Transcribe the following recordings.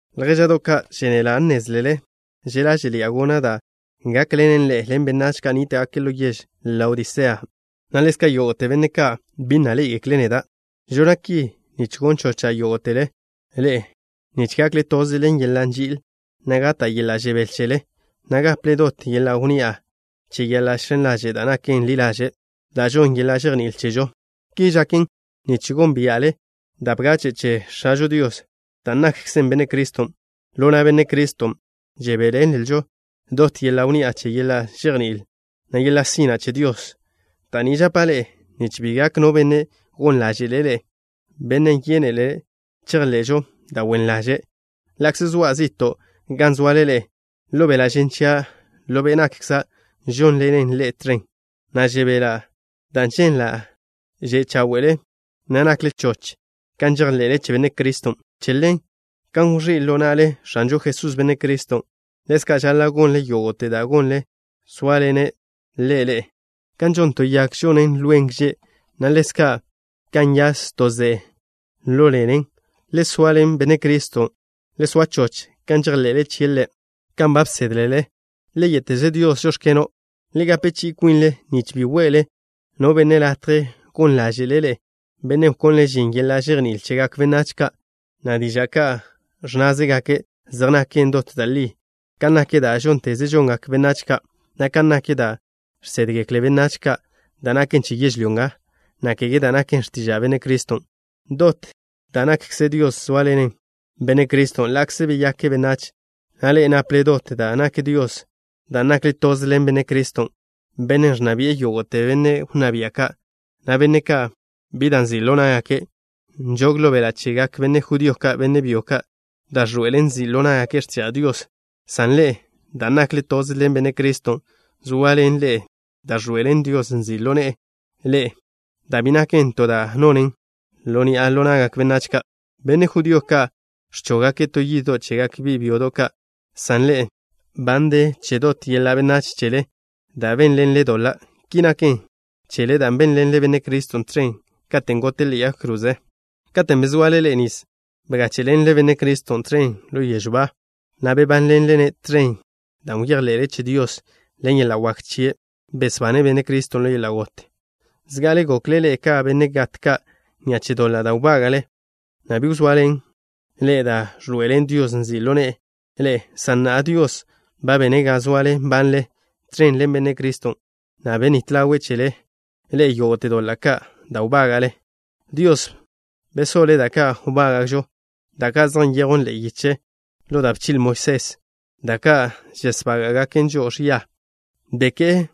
Ljéža'do' ka', žénela' nnézlele že' ḻáže'ḻi'a gona' da' gákḻenen ḻe'e ḻen benách ka' nníta'gake' ḻo yež Laodisea, na' ḻezka' yógo'te benne' ka' bi na' ḻé'egekle' neda'. Žona' ki nich gon chocha' yógo'tele ḻe'e nich gakle toze ḻo yeḻa' nži'il, na' gata' yeḻa' žebél chele, na' gaple dot yeḻa' wnni'a che yeḻa' žx̱en ḻaže' da' naken ḻi ḻaže', da' žonn yeḻa' žejní'il chežo. Ki žaken nich gónbia'le da' bgache' che X̱ažo Dios, dan' nakkzen Benne' Criston'. Ḻo na' Benne' Criston' žebéḻenlžo dot yeḻa' wnni'a che yeḻa' žejní'il, na' yeḻa' sina' che Dios. Da' ni žapa' ḻe'e nich bi gak no benne' gon ḻáže'le' ḻe'e, bennen' yénele' chejḻe'žo da' wen ḻaže'. Ḻa'kze zoa' zi'to' gan zoale ḻe'e ḻo beḻa' žen chia', ḻo be' nakkza' žónḻena' ḻe'e toze, na' žebela' dan' ženla' že' cháwe'le, na' nakle choch kan žejḻe'le che Benne' Criston'. Che ḻen, kan wẕí' ḻo na'le X̱anžo Jesús, Benne' Criston', ḻezka' žaḻa' gonle yógo'te da' gonle, zóaḻene' Ḻe' ḻe'e. Kan žon to yag, ẕzoan lwen gže', na' ḻezka' kan nyas to ze'e ḻo ḻenen, le soaḻen Benne' Criston'. Le soa choch kan žejḻe'le chie' Ḻe', kan ba bsédlele. Le yé'teze Dios: “Žóx̱keno'.” Le gape chi'i kwinle nich bi we'le no benne' latje gon ḻáže'le' ḻe'e, bennen' wkonle' žin yeḻa' žejní'il chegak benách ka', na' diža' ka' ẕnnázegake' zej naken dot da' li, kan nak da' žónteze žongak benách ka', na' kan nak da' žsédgekle benách ka', da' naken che yežlyó nga, na' kege da' naken x̱tiža' Benne' Criston'. Dot da' nakkze Dios zóaḻenen Benne' Criston' ḻa'kze beyake' benách, na' ḻe'e naple dot da' nak Dios dan' nakle toze ḻen Benne' Criston', Bennen' ẕnna bi'e yógo'te benne' wnná bia' ka', na' benne' ka' bi da' nzi' ḻo ná'gake'. Nžog ḻo beḻa' chegak benne' judío, benne' byo ka', da' ẕḻoe'elen nzi' ḻo ná'gake' x̱tiža' Dios, san ḻe'e, dan' nakle toze ḻen Benne' Criston', zoaḻen ḻe'e da' ẕḻoe'elen Dios nzi' ḻo ne'e ḻe'e, da' bi naken to da' nonen ḻo ni'a ḻo na'gak benách ka'. Benne' judío ka' ẕchóggake' to yiddo' chegak bi' byodo' ka', san ḻe'e, ba nde che dot yeḻa' benách chele da' bénḻenlen doḻa'. Ki naken chele dan' bénḻenle Benne' Criston' tẕen katen' gote' ḻe'e yag kroze. Katen' bezoale ḻe'e nis bgáche'ḻenle Benne' Criston' tẕen ḻo yežw ba, na' bebánḻenle-ne' tẕen dan' bejḻe'le che Dios, ḻen yeḻa' wak chie' besbane' Benne' Criston' ḻo yeḻa' got. Zga'ale gokle ḻe'e ka benne' gat ka' ni'a che doḻa' da' wbága'le, na' bi wzoaḻen ḻe'e da' ẕḻoe'elen Dios nzi' ḻo ne'e ḻe'e, san na'a Dios ba bene' ga zoale nbanle tẕen ḻen Benne' Criston', na' benít ḻawe' chele ḻe'e yógo'te doḻa' ka' da' wbága'le. Dios bsoḻe' da' ka' wbága'žo, da' ka' zej nyejwn ḻe'e yiche ḻo da' bchi'le Moisés, da' ka' žesbága'gaken žo'o ẕia. Beké'e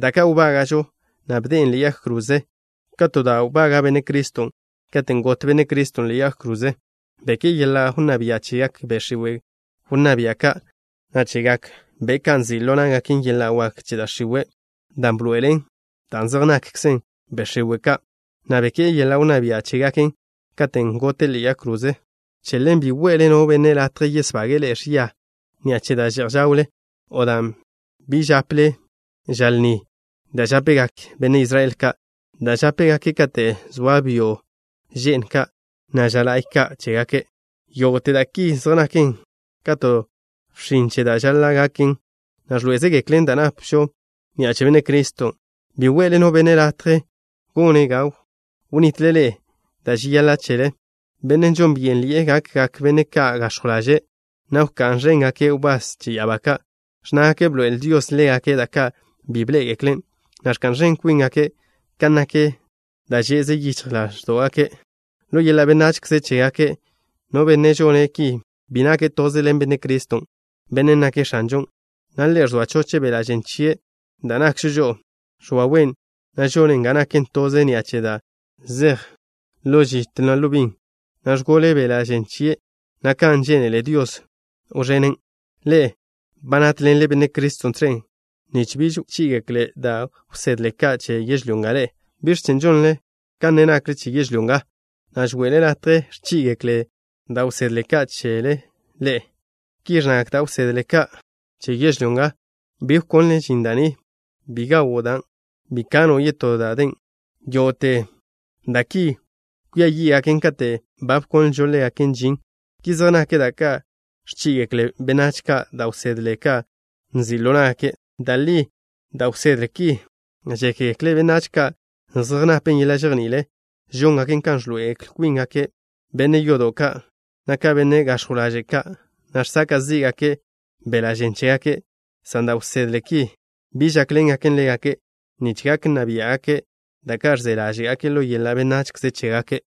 da' ka' wbága'žo, na' bde'en ḻe'e yag kroze ka to da' wbaga' Benne' Criston'. Katen' got Benne' Criston' ḻe'e yag krozen', beké'e yeḻa' wnná bia' chegak be' x̱iwe' wnná bia' ka', na' chegak be' ka' nzi' ḻo ná'gaken yeḻa' wak che da' x̱iwe', dan' bḻoe'ele' dan' zej nakkze be' x̱iwe' ka', na' beké'e yeḻa' wnná bia' chégaken, katen' gote' ḻe'e yag kroze na'. Che ḻen, bi we'le no benne' latje yesbage'e ḻe'e ẕia ni'a che da' že'j žawle, o dan' bi žápele ža lni da' žápegak benne' Israel ka', da' žápegake' kate' zoa byo' že'n ka', na' ža la'y ka' chégake'. Yógo'te da' ki zej naken ka to bxin che da' žaḻa' gaken, na' ẕḻoé'ezegeklen da' napžo ni'a che Benne' Criston'. Bi we'le no benne' latje gone' ga wnitle ḻe'e da' žeyaḻa' chele, bennen' žon byénḻi'e gakgak benne' ka' gax̱jw ḻaže', na' wka'n ẕéngake' wbás che ya'abá ka'. Ẕnnágake' bḻoe'el Dios ḻégake' da' ka' bi bḻé'egeklen', na' ẕka'n ẕen kwíngake' kan nak da' že'ze yíchjgake' ḻo yeḻa' benachze chégake'. No benne' žone' ki bi nake' toze ḻen Benne' Criston', Bennen' nake' X̱anžon', na' Ḻe' ẕzoa choche' beḻa' žen chie', da' nakžo žo'o. Ẕwawen', na' žone' ga naken toze ni'a che da' zej ḻo žit ḻo bin, na' ẕgole beḻa' žen chie' na' kan žénele Dios wẕenen'. Ḻe'e ba nátḻenle Benne' Criston' tẕen nich biž wchí'igekle da' wsedle ka' che yežlyó nga ḻe'e. ¿Biẕ chen' žonle kan ne nakle che yežlyó nga, na' žo'le latje ẕchí'igekle da' wsedle ka' chen ḻe'e? Ki ẕnnagak da' wsedle ka' che yežlyó nga: Bi wkonle žin da' ni. Bi gawo' dan'. Bi kano' yetó da' den. Yógo'te da' ki kwia yí'gaken katen' ba bkonlžo ḻégaken žin. Ki zej nak da' ka' ẕchí'igekle benách ka', da' wsedle ka' nzi' ḻo ná'gake'. Da' li, da' wsedle ki, žékgekle benách ka' zej napen yeḻa' žejní'il. Žóngaken ga ẕḻoe'el kwíngake' ka benne' yodo' ka', na' ka benne' gax̱jw ḻaže' ka', na' žsaka' zí'gake' beḻa' žen chégake', san da' wsedle ki bi žákḻengaken ḻégake' nich gak nna biá'gake' da' ka' ẕze ḻáže'gake' ḻo yeḻa' benachze chégake'.